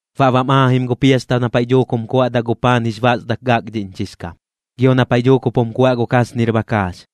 Baꞌ bam aajim gu piasta na paiꞌ dhuuk jum kuaꞌdaꞌ gu paan jix basdak gakdhiꞌñchix kam, gio na paiꞌ dhuuk jup jum kuaꞌ gu kasnir bakaax.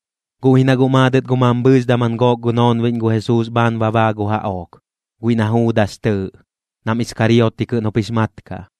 Guꞌ ji na guꞌ maadɨt gu mambhɨɨx daman gook gu noonbiꞌñ gu Jesuus bhaan baa gu jaꞌook, guiꞌ na Juudas tɨɨꞌ, nam Iskarioti kɨꞌn jup jix mat kaꞌ.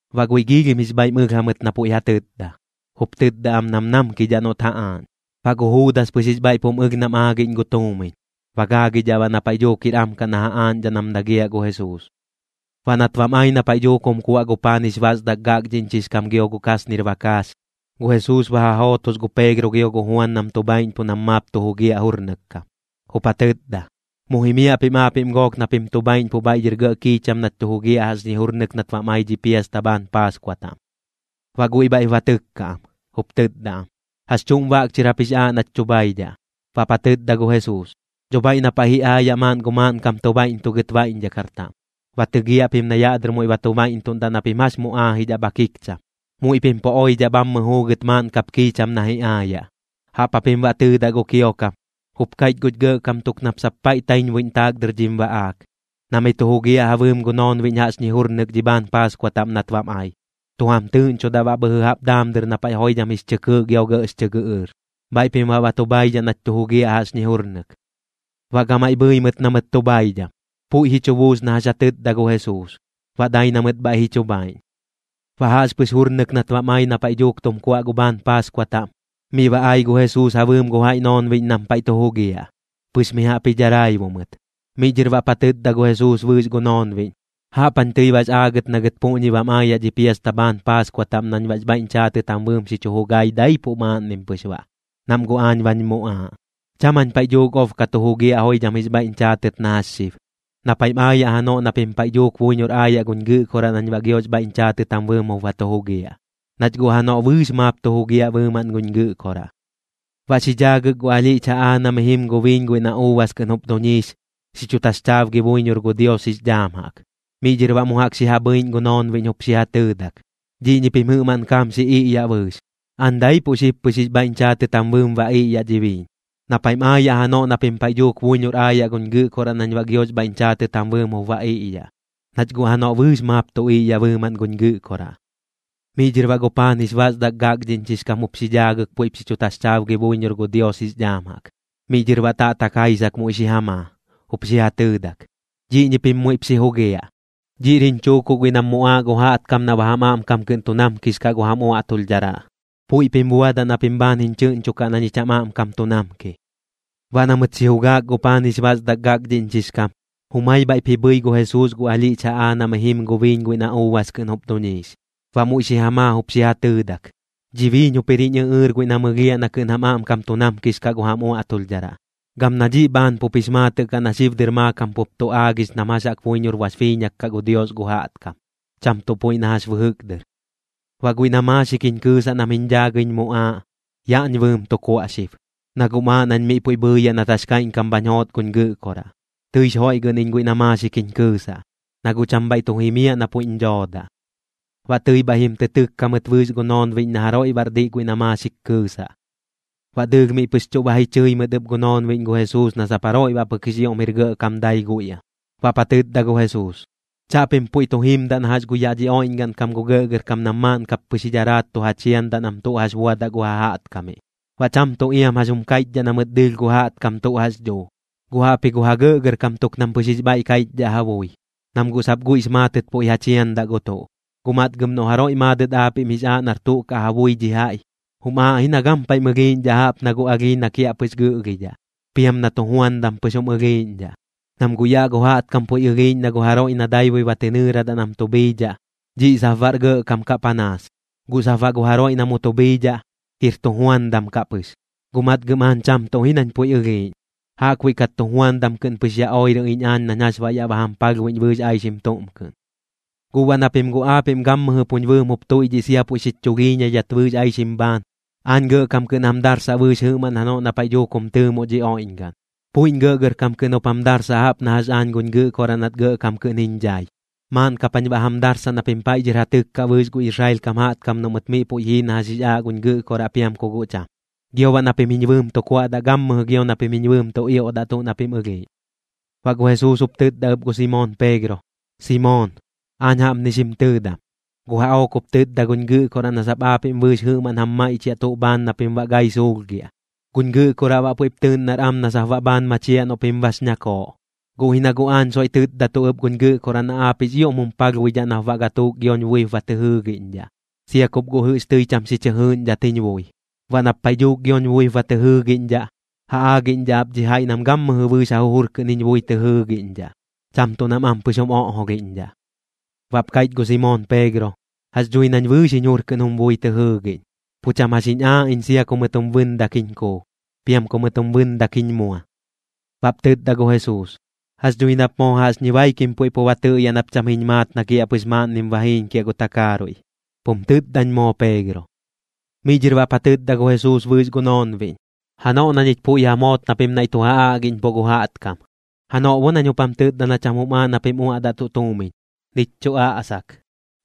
Baꞌ guiꞌ giilhim jix bhaiꞌm ɨlh jamɨt na puiꞌ ja tɨtda, jup tɨtda am nam namkidhaꞌ noꞌt ja aaꞌñ. Baꞌ gu Juudas pɨx jix bhaiꞌp jum ɨlh nam aagiꞌñ gu tuumiñ, ba gaagidhaꞌ baꞌ na paiꞌ dhuuk jir am kaꞌ na ja aaꞌñdhaꞌ nam dagiaꞌ gu Jesuus. Baꞌ nat bam ai na paiꞌ dhuuk jum kuaꞌ gu paan jix basdak gakdhiꞌñchix kam gio gu kasnir bakaax, gu Jesuus ba ja jootos gu Peegro gio gu Juan nam tu bhaiꞌñpuꞌ nam maap tu jugiaꞌ jurnɨk kam, jup ja tɨtda: ―Mu jimiaꞌ pim aapiꞌm gook na pim tu bhaiꞌñpuꞌ bhaiꞌ dhɨr gɇꞌ kiicham nach tu jugiaꞌ jaꞌxñi jurnɨk nat bam ai dhi piasta bhaan Paaskua taꞌm. Baꞌ guiꞌ bhaiꞌp ba tɨkka am, jup tɨtda am: ―¿Jax chuꞌm baꞌk chɨr jap jix aaꞌ nach tu bhaidhaꞌ? Baꞌp ja tɨtda gu Jesuus: ―Dho bhaiꞌ na paiꞌ ji aayaꞌ maaꞌn gu maaꞌnkam tu baiꞌntugɨt baiꞌñdhakar taꞌm, ba tɨgiaꞌ pim na yaꞌ dɨr muiꞌ ba tu baiꞌntuꞌndaꞌ na pim jax mu aajidhaꞌ bha kikcham. Muiꞌ pim pu oidhaꞌ bhammɨ juugɨt maaꞌn kap kiicham na ji aayaꞌ. Jaꞌp japim baꞌ tɨɨdaꞌ gu kiokam: “Jup kaiꞌch guch gɇꞌkam tuk nap sap paiꞌ taiñbuiꞌñ taak dɨr dhim baꞌaak, na miꞌ tu jugiaꞌ ja bɨɨm gu noonbiꞌñ jaꞌxñi jurnɨk dhi bhaan Paaskua taꞌm nat bam ai.” Tu jam tɨɨꞌñchodaꞌ baꞌ bhɨjɨ jaꞌp daam dɨr na paiꞌ joidham jix chɨ kɨɨꞌ gio gɇꞌx chɨ gɨꞌɨɨr. Bhaiꞌ pim baꞌ ba tu bhaidhaꞌ nach tu jugiaꞌ jaꞌxñi jurnɨk. Baꞌ gamaiꞌ bhɨi mɨt na mɨt tu bhaidham. Puiꞌ ji chu buus na jax ja tɨtda gu Jesuus, baꞌ dai na mɨt bhaiꞌ ji chu bhaiꞌñ. Baꞌ jaꞌxpɨx jurnɨk nat bam ai na paiꞌ dhuuk tum kuaꞌ gu bhaan Paaskua taꞌm, miꞌ ba ai gu Jesuus ja bɨɨm gu jaiꞌ noonbiꞌñ nam paiꞌ tu jugiaꞌ, pɨx mi jaꞌp ji dharaibu mɨt. Miꞌ dhɨr baꞌp ja tɨtda gu Jesuus bɨɨx gu noonbiꞌñ: ―¡Jaꞌp jañ tɨi bax aagɨt na gɨt puꞌñi bam aayaꞌ dhi piasta bhaan Paaskua taꞌm nañ baꞌx bhaiꞌñ chaatɨt jam bɨɨm xi chu jugai daipuꞌ maaꞌnnim pɨx baꞌ, nam guꞌ aañ bañ muꞌaaꞌ! Cham jañ paiꞌ dhuuk ob ka tu jugiaꞌ joidham jix bhaiꞌñ chaatɨt na jax xib. Na paiꞌm aayaꞌ janoꞌ na pim paiꞌ dhuuk buiñor aayaꞌ guñ Gɨꞌkoraꞌ nañ baꞌ giox bhaiꞌñ chaatɨt jam bɨɨm jup ba tu jugiaꞌ, nach guꞌ janoꞌ bɨɨx maap tu jugiaꞌ bɨɨmaꞌn guñ Gɨꞌkoraꞌ. Baꞌ xi dhaagɨk gu alhiꞌch jaꞌaa na mi jim gu biiñ guiꞌ na uubas kɨꞌn jup duñiix, xi chu taxchaabgi buiñor gu Dios jix dhaam jaꞌk. Miꞌ dhɨr baꞌ mu jaꞌk xi ja bhɨiꞌñ gu noonbiꞌñ jup xi ja tɨɨdak: ―Dhiꞌñi pim jɨꞌmaꞌn kaam xi iꞌyaꞌ bɨɨx. Aañ daipuꞌ xib pɨx jix bhaiꞌñ chaatɨt jam bɨɨm ba iꞌyaꞌ dhi biiñ. Na paiꞌm aayaꞌ janoꞌ na pim paiꞌ dhuuk buiñor aayaꞌ guñ Gɨꞌkoraꞌ nañ baꞌ giox bhaiꞌñ chaatɨt jam bɨɨm jup ba iꞌyaꞌ, nach guꞌ janoꞌ bɨɨx maap tu iꞌyaꞌ bɨɨmaꞌn guñ Gɨꞌkoraꞌ. Miꞌ dhɨr baꞌ gu paan jix basdak gakdhiꞌñchix kam jup xi dhaagɨk puiꞌp xi chu taxchaabgi buiñor gu Dios jix dhaam jaꞌk. Miꞌ dhɨr baꞌ taꞌtak jaisak muiꞌ xi ja maa, jup xi ja tɨɨdak: ―Dhiꞌñi pim muiꞌp xi jugiaꞌ. Dhiꞌr jiñ chuukuꞌ guiꞌ nam muꞌaaꞌ gu jaꞌtkam na baꞌ jam aꞌmkam kɨꞌn tu namkix kaꞌ gu jam uaꞌtulhdharaꞌ. Puiꞌ pim buadaꞌ na pim bhaan jiñ chɨꞌñchokaꞌ na ñich jam aꞌmkam tu namki. Baꞌ na mɨt xi jugaak gu paan jix basdak gakdhiꞌñchix kam, jumai bhaiꞌp ji bhɨi gu Jesuus gu alhiꞌch jaꞌaa na mi jim gu biiñ guiꞌ na uubas kɨꞌn jup duñiix. Baꞌ muiꞌ xi ja maa jup xi ja tɨɨdak: ―Dhi biiñ jup jir jiñ ɨꞌɨɨr guiꞌ na mɨlhiaꞌ na kɨꞌn jam aꞌmkam tu namkix kaꞌ gu jam uaꞌtulhdharaꞌ. Gam na dhiꞌ bhaan pup jix maatɨꞌ kaꞌ na xib dɨr maakam pup tu aagix nam jax jaꞌk buiñor bax biiñak kaꞌ gu Dios gu jaꞌtkam, cham tuꞌ puiꞌ na jax bɨjɨk dɨr. ’Baꞌ guiꞌ na maaxik jiñ kɨɨsaꞌ nam jiñ dhaagɨiñ muꞌaaꞌ, yaꞌñ bɨɨm tu kuaꞌ xib, na guꞌm aaꞌ nañ miꞌ puiꞌ bhɨɨyaꞌ nat jax kaiꞌñkam bhañ joot guñ Gɨꞌkoraꞌ. Tɨix joiꞌgɨꞌn iñ guiꞌ na maaxik jiñ kɨɨsaꞌ, na guꞌ cham bhaiꞌ tu jimiaꞌ na puiꞌñ dhoodaꞌ. Baꞌ tɨi bhaiꞌ jim tɨ tɨkka mɨt bɨɨx gu noonbiꞌñ na jaroiꞌ baꞌr diꞌ guiꞌ na maaxik kɨɨsaꞌ. Baꞌ dɨɨlh miꞌ pɨx chuꞌ ba ji chɨi mɨt ɨp gu noonbiꞌñ gu Jesuus na sap jaroiꞌ baꞌ pɨk jix ioꞌm jir gɇꞌkam dai guiꞌ am. Baꞌp ja tɨtda gu Jesuus: ―Chaꞌpim puiꞌ tu jimdaꞌ na jax gu yaꞌ dhi oiꞌñgaꞌn kam gu gɇꞌgɇrkam nam maaꞌn kap pɨx ji dharaat tu ja chiandaꞌ nam tuꞌ jax buadaꞌ gu ja jaꞌtkamiꞌ, baꞌ cham tuꞌ iam jax jum kaiꞌchdhaꞌ na mɨt dɨɨlh gu jaꞌtkam tuꞌ jax dhuu. Guꞌ jaꞌpji gu ja gɇꞌgɇrkam tuk nam pɨx jix bhaiꞌ kaiꞌchdhaꞌ ja bui, nam guꞌ sap guiꞌx maatɨt puiꞌ ja chiandaꞌ gu tuꞌ. Guꞌ matgɨm noꞌ jaroiꞌ maadɨt aapiꞌm jix aaꞌ nar tuꞌ kaꞌ ja bui dhi jaiꞌ, jum aaꞌ ji na gampaiꞌm ɨlhiiꞌñdhaꞌ jaꞌp na gu alhii na kiaꞌpɨx gɨꞌlhidhaꞌ, piam na tujuandam pɨx jum ɨlhiiꞌñdhaꞌ. Nam guꞌ yaꞌ gu jaꞌtkam puiꞌ ɨlhiiꞌñ na gu jaroiꞌ na daibui ba tɨ nɨɨradaꞌ nam tu bhiidhaꞌ, dhiꞌ sap baꞌr gɇꞌkam kaꞌ panaas, guꞌ sap baꞌ gu jaroiꞌ na mu tu bhiidhaꞌ, jir tujuandam kaꞌ pɨx. Guꞌ matgɨm aañ cham tuꞌ ji nañ puiꞌ ɨlhiiꞌñ, jaꞌkbuiꞌ kat tujuandam kɨꞌn pɨx ya oirɨ iñ aañ nañ jax baꞌ yaꞌ ba jam palhbuiꞌñ bɨɨx aixim tuꞌm kɨꞌn. ’Guꞌ baꞌ na pim guꞌ aapiꞌm gammɨjɨ puñ bɨɨm jup tuiꞌdhiꞌ sia puiꞌ xich chulhiiñaidhat bɨɨx aixim bhaan, aañ gɇꞌgɇrkam kɨꞌn jam darsaꞌ bɨɨx jɨꞌmaꞌn janoꞌ na paiꞌ dhuuk jum tɨɨmoꞌ dhi oiꞌñgaꞌn. Puiꞌñ gɇꞌgɇrkam kɨꞌn jup jam darsaꞌ jaꞌp na jax aañ guñ Gɨꞌkoraꞌ nat gɇꞌkam kɨꞌn jiñ dhai. Maaꞌn kap jañ baꞌ jam darsaꞌ na pim paiꞌ dhɨr ja tɨkkaꞌ bɨɨx gu Israel kam jaꞌtkam noꞌ mɨt miꞌ puiꞌ jii na jax jix aaꞌ guñ Gɨꞌkoraꞌ piam ku guꞌ cham. Gio baꞌ na pim jiñ bɨɨm tu kuaꞌdaꞌ gammɨjɨ gio na pim jiñ bɨɨm tu ioꞌdaꞌ tuꞌ na pim ɨlhiiꞌñ. Baꞌ gu Jesuus jup tɨtda ɨp gu Simoon Peegro: ―Simoon, aañ jaꞌpni xim tɨɨdam. Gu jaꞌook jup tɨtda guñ Gɨꞌkoraꞌ na sap aapiꞌm bɨɨx jɨꞌmaꞌn jam maiꞌchiaꞌ tuꞌ bhaan na pim baꞌ gai suulhgiaꞌ. Guñ Gɨꞌkoraꞌ baꞌ puiꞌp tɨɨꞌn nar am na sap baꞌ bhaan machiaꞌ noꞌ pim bax ñakooꞌ. Guꞌ ji na guꞌ aañ soiꞌ tɨtdatuꞌ ɨp guñ Gɨꞌkoraꞌ na aap jix ioꞌm jum palhbuidhaꞌ nap baꞌ gatuuk gioñ buip ba tɨ jɨɨgiꞌñdhaꞌ, sia kup guꞌ jɨꞌx tɨi cham xi chɨ jɨɨꞌñdhat jiñ bui. Baꞌ nap paiꞌ dhuuk gioñ buip ba tɨ jɨɨgiꞌñdhaꞌ, ja aagiꞌñdhaꞌ ap dhi jaiꞌ nam gammɨjɨ bɨɨx ja jujur kɨꞌn jiñ bui tɨ jɨɨgiꞌñdhaꞌ, cham tuꞌ nam ampɨx jum oꞌjolhiꞌñdhaꞌ. Baꞌp kaiꞌch gu Simoon Peegro: ―Jax dhui nañ bɨɨx jiñ jur kɨꞌn jum bui tɨ jɨɨgiꞌñ. Pu cham jax jiñ aaꞌ iñ sia ku mɨt jum bɨndak jiñ kuu, piam ku mɨt jum bɨndak jiñ mua. Baꞌp tɨtda gu Jesuus: ―Jax dhui nap moo jaꞌxñi baikim puiꞌ pu ba tɨꞌyaꞌ nap cham jiñ maat na kiaꞌpɨx maaꞌnnim ba jiiñkiaꞌ gu takaaruiꞌ. Pum tɨtdañ moo Peegro. Miꞌ dhɨr baꞌp ja tɨtda gu Jesuus bɨɨx gu noonbiꞌñ: ―Janoꞌ na ñich puiꞌ jam joot na pim naiꞌ tu ja aꞌgiꞌñpuꞌ gu jaꞌtkam, janoꞌ bo nañ jup jam tɨtda na cham jum aaꞌ na pim uaꞌdaꞌ tuꞌ tuumiñ, nich chuꞌ aꞌsak,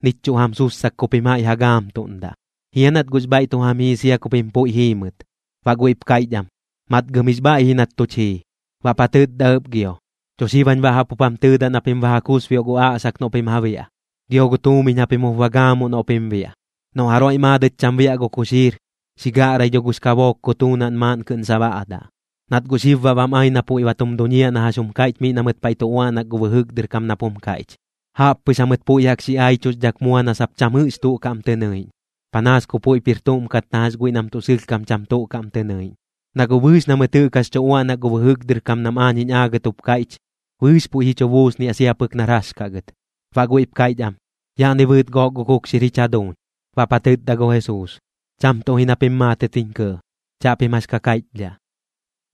nich chuꞌ jam sussak ku pim jaiꞌ ja gaamtuꞌndaꞌ, ¿jia nat guꞌx bhaiꞌ tu jam jii sia ku pim puiꞌ jiimɨt? Baꞌ guiꞌp kaiꞌch am: ―Matgɨm jix bhaiꞌ ji nat tuch jii. Baꞌp ja tɨtda ɨp gio: ―Dho xib jañ baꞌ jaꞌp jup jam tɨtda na pim ba ja kusbioꞌ gu aꞌsak noꞌ pim ja biaꞌ, gio gu tuumiñ japim jup ba gaamuꞌ noꞌ pim biaꞌ. Noꞌ jaroiꞌ maadɨt cham biaꞌ gu kuxiir, xi gaꞌrai dho gux kabook kutuunaꞌn maaꞌn kɨꞌn sabaꞌdaꞌ. Nat guꞌ xib baꞌ bam ai na puiꞌ ba tum duñiaꞌ na jax jum kaiꞌch miꞌ na mɨt paiꞌ tu uaꞌnak gu bɨjɨk dɨr kam nap jum kaiꞌch: “Jaꞌp pɨx jamɨt puiꞌ jaꞌk xi aichuxdhak mua na sap cham jɨꞌx tuꞌ kaꞌm tɨ nɨiꞌñ, panaas ku puiꞌp jir tuꞌm kat na jax guiꞌ nam tuꞌ sɨlhkam cham tuꞌ kaꞌm tɨ nɨiꞌñ.” Na guꞌ bɨɨx na mɨt jɨꞌk jax tu uaꞌnak gu bɨjɨk dɨr kam nam aañ jiñ aagɨt jup kaiꞌch, bɨɨx puiꞌ ji chu buusniaꞌ sia pɨk nar jax kaꞌ gɨt. Baꞌ guiꞌp kaiꞌch am: ―Yaꞌni bɨɨt gook gu kukxir jich jaduuñ. Baꞌp ja tɨtda gu Jesuus: ―Cham tuꞌ ji na pim maatɨt jiñ kɇɇ. Chaꞌpim jax ka kaiꞌchdhaꞌ.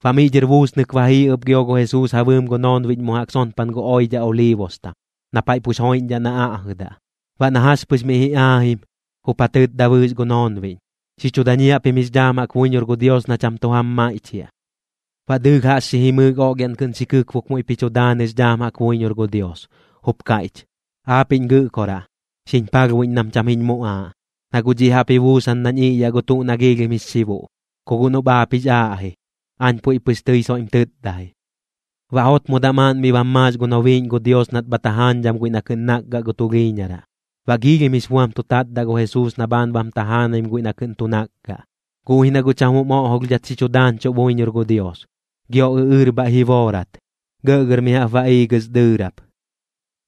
Baꞌ miꞌ dhɨr buusnɨk ba jii ɨp gio gu Jesuus ja bɨɨm gu noonbiꞌñ mu jaꞌk sonpan gu oidhaꞌ Oliibostam, na paiꞌ pux joiꞌñ na aꞌjɨdaꞌ. Baꞌ na jax pɨx miꞌ ji aajim, jup ja tɨtda bɨɨx gu noonbiꞌñ: ―Xi chu dañiaꞌ pim jix dhaam jaꞌk buiñor gu Dios na cham tu jam maiꞌchiaꞌ. Baꞌ dɨɨlh jaꞌx xi jimɨɨk oꞌlhiaꞌn kɨꞌn xi kɨkbok muiꞌp ji chu daanɨx dhaam jaꞌk buiñor gu Dios, jup kaiꞌch: ―Aapiꞌñ Gɨꞌkoraꞌ, xiñ palhbuiꞌñ nam cham jiñ muꞌaaꞌ, na guꞌ dhiꞌ jaꞌp ji buusan nañ iꞌyaꞌ gu tuꞌ na giilhim jix xibuꞌ. Ku guꞌ noꞌp aap jix aaꞌ ji, aañ puiꞌ pɨx tɨi soiꞌm tɨtda ji. Baꞌ jotmodaꞌ maaꞌn miꞌ bam maax gu nobiiꞌñ gu Dios nat bha tajaañdham guiꞌ na kɨꞌn nakgaꞌ gu tulhiiñaraꞌ. Baꞌ giilhim jix buam tu tatdaꞌ gu Jesuus na bhaan bam tajaanaim guiꞌ na kɨꞌn tu nakgaꞌ, guꞌ ji na guꞌ cham jum oꞌjolhdhat xi chu daañchuꞌ buiñor gu Dios. Gio ɨꞌɨɨr bhaiꞌ ji boorat, gɇꞌgɇr mi jaꞌp ba iigɨs dɨɨrap.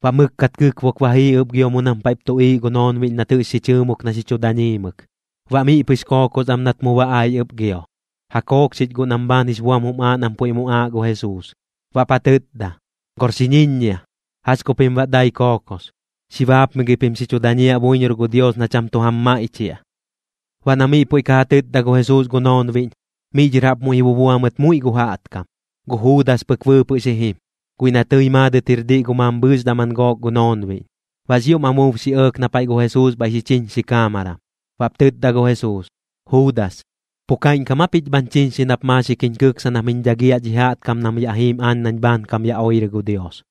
Baꞌ mɨkkat kɨkbok ba jii ɨp gio mu nam paiꞌp tuꞌiiꞌ gu noonbiꞌñ nat jɨꞌx xi chɨɨmok na xi chu dañiimɨk. Baꞌ miꞌ pɨx kookos am nat mu ba ai ɨp gio, ja kookxich guꞌ nam bhaan jix buam jum aaꞌ nam puiꞌ muꞌaaꞌ gu Jesuus. Baꞌp ja tɨtda: ―¡Gor xi ñiññia! ¿Jax ku pim baꞌ dai kookos? Xi baapmigɨi pim xi chu dañiaꞌ buiñor gu Dios na cham tu jam maiꞌchiaꞌ. Baꞌ na miꞌ puiꞌ ka ja tɨtda gu Jesuus gu noonbiꞌñ, miꞌ dhɨr jaꞌp muiꞌ ji bubua mɨt muiꞌ gu jaꞌtkam. Gu Juudas pɨk bɨɨpɨꞌ xi jim, guiꞌ na tɨi maadɨt jir diꞌ gu mambhɨɨx daman gook gu noonbiꞌñ. Baꞌx ioꞌm amuub xi ɇɇk na paiꞌ gu Jesuus bhaiꞌ xi chiñxi kaamaram. Baꞌp tɨtda gu Jesuus: ―Juudas, ¿pu kaiꞌñkam aa pich bhañ chiñxi nap maaxik jiñ kɨksa nam jiñ dhagiaꞌ dhi jaꞌtkam nam yaꞌ jiim aañ nañ bhaankam ya oirɨ gu Dios?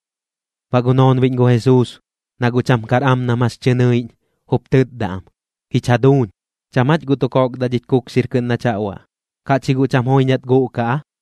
Baꞌ gu noonbiꞌñ gu Jesuus, na guꞌ cham kar am nam jax tɨ nɨiꞌñ, jup tɨtda am: ―¿Jich jaduuñ, cham jach guꞌ tu kokdaꞌ dhich kukxir kɨꞌn nach ja uaꞌ, kaꞌch ji guꞌ cham joiñat guꞌkaꞌ aa?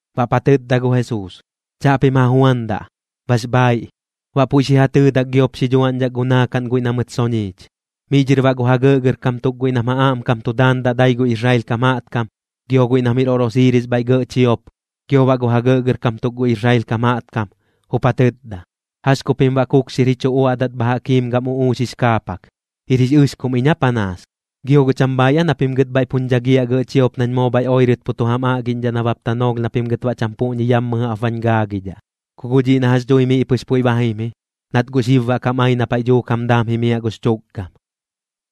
Baꞌp ja tɨtda gu Jesuus: ―Chaꞌpim ja juandaꞌ. Bax bhaiꞌ. Baꞌ puiꞌ xi ja tɨɨdak giop xi dhuaꞌñdhak gu naakaꞌn guiꞌ na mɨt soñiich. Miꞌ dhɨr baꞌ gu ja gɇꞌgɇrkam tuk guiꞌ nam ja aꞌmkam tu daandaꞌ dai gu Israel kam jaꞌtkam, gio guiꞌ nam jir oꞌrosiiris bhaiꞌ gɇꞌ chiop, gio baꞌ gu ja gɇꞌgɇrkam tuk gu Israel kam jaꞌtkam, jup ja tɨtda: ―¿Jax ku pim baꞌ kukxir ji chu uaꞌdat bha jaꞌk jiim gam uꞌuux jix kaapak? ¿Jir jix ɨxkum iñ aa panaas? ¿Gio guꞌ cham bhaaiꞌ aa na pim gɨt bhaiꞌ puñ dhagiaꞌ gɇꞌ chiop nañ moo bhaiꞌ oirɨt pu tu jam aꞌgiꞌñdhaꞌ nabap tanoolh na pim gɨt baꞌ cham puꞌñi yammɨ jaꞌp bañ gaagidhaꞌ? Ku guꞌ dhiꞌ na jax dhui miꞌ pɨx puiꞌ ba jim ji, nat guꞌ xib baꞌ kam ai na paiꞌ dhuuk jam daam jimiaꞌ gux chukgam.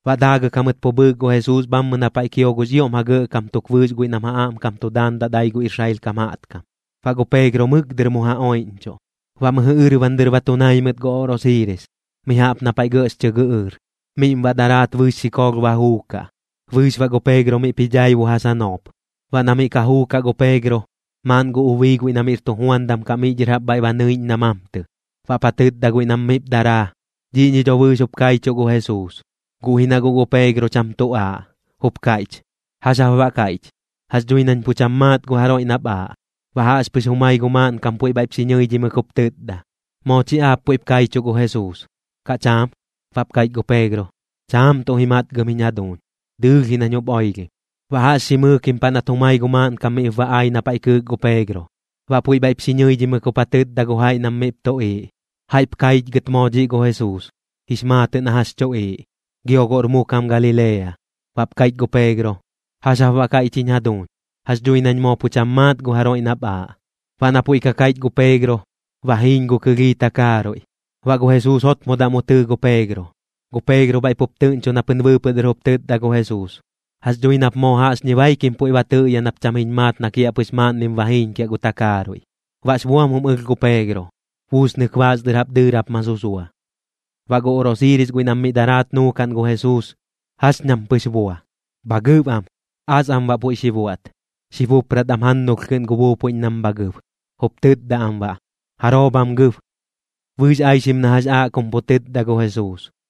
Baꞌ daagɨk jamɨt pu bhɨɨk gu Jesuus bhammɨ na paiꞌ kio gux ioꞌm ja gɇꞌkam tuk bɨɨx guiꞌ nam ja aꞌmkam tu daandaꞌ dai gu Israel kam jaꞌtkam. Baꞌ gu Peegro mɨk dɨr mu ja oiꞌñchuꞌ. Baꞌ mɨjɨ ɨrban dɨr ba tu nai mɨt gu oꞌrosiiris, mi jaꞌp na paiꞌ gɇꞌx chɨ gɨꞌɨɨr, miꞌm baꞌ daraat bɨɨx xikoolh ba juukaꞌ, bɨɨx gu Peegro miꞌp ji dhaibu ja sanoop. Baꞌ na miꞌ ka juukaꞌ gu Peegro, maaꞌn gu ubii guiꞌ na miꞌr tujuandam kaꞌ miꞌ dhɨr jaꞌp bhaiꞌ ba nɨiꞌñ na mamtɨ, baꞌp ja tɨtda guiꞌ nam miꞌp daraa: ―Dhiꞌñi dho bɨɨx jup kaichuꞌ gu Jesuus. Guꞌ ji na guꞌ gu Peegro cham tu aaꞌ, jup kaiꞌch: ―¿Jax jap baꞌ kaiꞌch? Jax dhui nañ pu cham maat gu jaroiꞌ nap aaꞌ. Baꞌ jaꞌxpɨx jumai gu maaꞌnkam puiꞌ bhaiꞌp xi ñɨidhimɨk jup tɨtda: ―Moo chi aap puiꞌp kaichuꞌ gu Jesuus, ¿kaꞌ cham? Baꞌp kaiꞌch gu Peegro: ―Cham tuꞌ ji matgɨm jiñ jaduuñ. Dɨɨlh ji nañ jup oilhim. Baꞌ jaꞌx xi mɨɨkim paꞌ nat jumai gu maaꞌnkam miꞌp ba ai na paiꞌ kɨɨk gu Peegro, baꞌ puiꞌ bhaiꞌp xi ñɨidhimɨk jup ja tɨtda gu jaiꞌ nam miꞌp tuꞌiiꞌ: ―Jaiꞌp kaichgɨt moo dhiꞌ gu Jesuus, jix maatɨꞌ na jax chuꞌiiꞌ, gio guꞌr mu kam Galilea. Baꞌp kaiꞌch gu Peegro: ―¿Jax jap baꞌ kaiꞌch jiñ jaduuñ? Jax dhui nañ moo pu cham maat gu jaroiꞌ nap aaꞌ. Baꞌ na puiꞌ ka kaiꞌch gu Peegro, ba jiiñ gu kɨlhii takaaruiꞌ. Baꞌ gu Jesuus jotmodaꞌ mu tɨɨ gu Peegro. Gu Peegro bhaiꞌ pup tɨꞌñcho na pɨn bɨɨpɨꞌ dɨr jup tɨtda gu Jesuus: “Jax dhui nap moo jaꞌxñi baikim puiꞌ pu ba tɨꞌyaꞌ nap cham jiñ maat na kiaꞌpɨx maaꞌnnim ba jiiñkiaꞌ gu takaaruiꞌ.” Baꞌx buam jum ɨlh gu Peegro. Buusnɨk baas dɨr jaꞌp dɨɨrap ma susua. Baꞌ gu oꞌrosiiris guiꞌ nam miꞌ daraat nuukaꞌn gu Jesuus, jax ñam pɨx bua. Bha gɨb am, as am baꞌ puiꞌ xi buaꞌt. Xi bupprat am jannulh kɨꞌn gu buupuiꞌñ nam bha gɨb, jup tɨtdadaꞌ am baꞌ: ―¿Jaroo bham gɨb? Bɨɨx aixim na jax aaꞌ kum pu tɨtda gu Jesuus.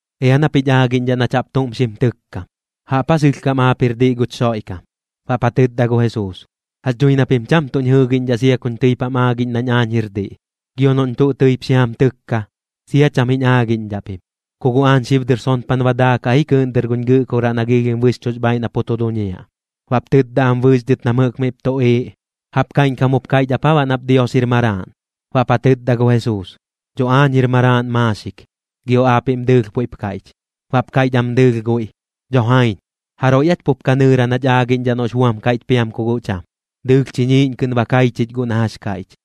―Ea nap jich aagiꞌñdhaꞌ nach jaꞌp tuꞌm xim tɨkkam. ¿Jaꞌp aa sɨlhkam aap jir diꞌ guch Xoiꞌkam? Baꞌp ja tɨtda gu Jesuus: ―Jax dhui na pim cham tuꞌñ jɨɨgiꞌñdhaꞌ sia kuñ tɨip jam aagiꞌñ nañ aañ jir diꞌ. Gio noꞌñ tuꞌ tɨip xi jam tɨkka, sia cham jiñ aagiꞌñdhaꞌ pim. Ku guꞌ aañ xib dɨr sonpan ba daakaꞌ ji kɨɨꞌn dɨr guñ Gɨꞌkoraꞌ na giilhim bɨxchuꞌx bhaaiꞌ na pu tu duñiaꞌ. Baꞌp tɨtda am bɨɨx dhɨt nam jɨꞌk miꞌp tuꞌiiꞌ: ―¿Jaꞌp kaiꞌñkam jup kaiꞌch ap aa baꞌ nap Dios jir Maraaꞌn? Baꞌp ja tɨtda gu Jesuus: ―Dho aañ jir Maraaꞌn maaxik, gio guꞌ aapiꞌm dɨɨlh puiꞌp kaiꞌch. Baꞌp kaiꞌch am dɨɨlh guiꞌ: ―¡Dho jaiñ! ¿Jaroiꞌ aach pup ka nɨɨraꞌ nach aagiꞌñdhaꞌ noꞌx buam kaiꞌch piam ku guꞌ cham? Dɨɨlh chiñiiꞌñ kɨꞌn ba kai chich guꞌ na jax kaiꞌch.